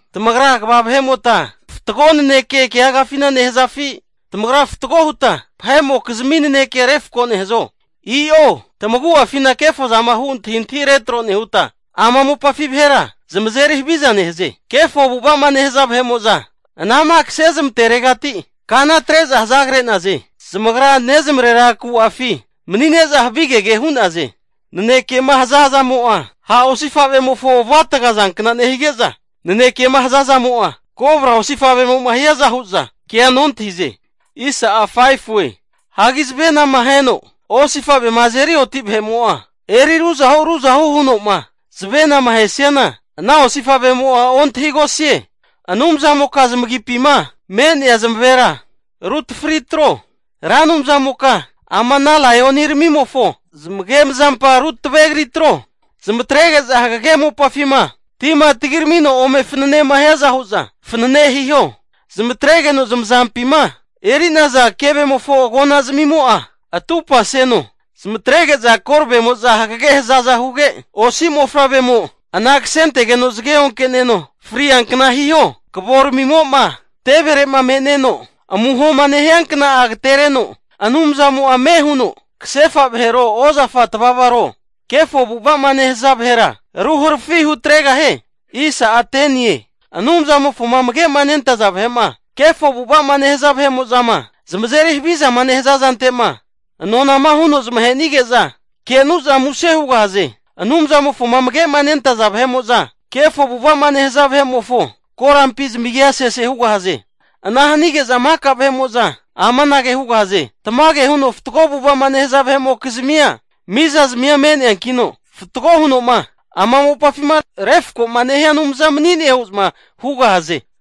Tamagra kva vahe'mota fatgo naneke keagafina nehazafi? Tamagra fatgo huta vahe'mokizmi naneke refko nehazo? I'o, tamagu'afina kefozama hu antahintahi retro nehuta, ama mopafi vahera zamazeri haviza nehaze. Kefo avu'ava'ma nehaza vahe'mo'za anama kasezmantetegati kana atre'za hazagre'naze. Zamagra nezamarera ku'afi mani'neza havigege hu'naze. Nanekema hazazamo'a ha' osifavemofo avu'ataga zankna nehige'za, nanekema nehazazamo'a kobra osifavemo'ma hiaza hu'za kea nontahize. Hagi zavenama aheno osifavema azeri oti vahe'mo'a, eri ruzahu ruzahu huno'ma zavenama ahesiana, ana osifavemo'a ontahigosie. Anumzamoka zamagipima me'nea zamavera rutafri atro. Ra Anumzamoka ama ana laioniramimofo zamagemazampa rutavegri atro. Zamatrege'za hagege mopafima tima tagiramino ome fananema hiaza hu'za fanene hiho. Zamatregeno zamazampima eri'naza kevemofo agonazmimo'a atupaseho. Zamatrege'za koravemo'za hagage hazaza huge, osi mofavremo ana kasentegeno zage onkeneno friankna hiho. Kavoramimo'ma tevere'ma me'neno amuhoma nehia kna'a agetereno, Anumzamo'a ame huno kasefa vahero, ozafa tavavaro, kefo avu'ava'ma nehaza vahera ruharafi hutregahie. Anumzamofoma amage'ma nentaza vahe'ma, kefo avu'ava'ma nehaza vahe'mo'zama zamazeri havizama nehaza zante'ma Anumzamo'za nonama huno zamahenige'za, kenu'za muse hugahaze. Anumzamofoma amage'ma nentaza vahe'mo'za kefo zamavu'zamava'ma nehaza vahe'mofo korampi zamagia sese hugahaze. Ana hanige'za maka vahe'mo'za amanage hugahaze, tamage huno fatgo avu'ava'ma nehaza vahe'mokizmia mizazmia me'neankino, fatgo huno'ma ama mopafima vahe'ma refkoma nehia Anumzana mani'ne hu'za hugahaze.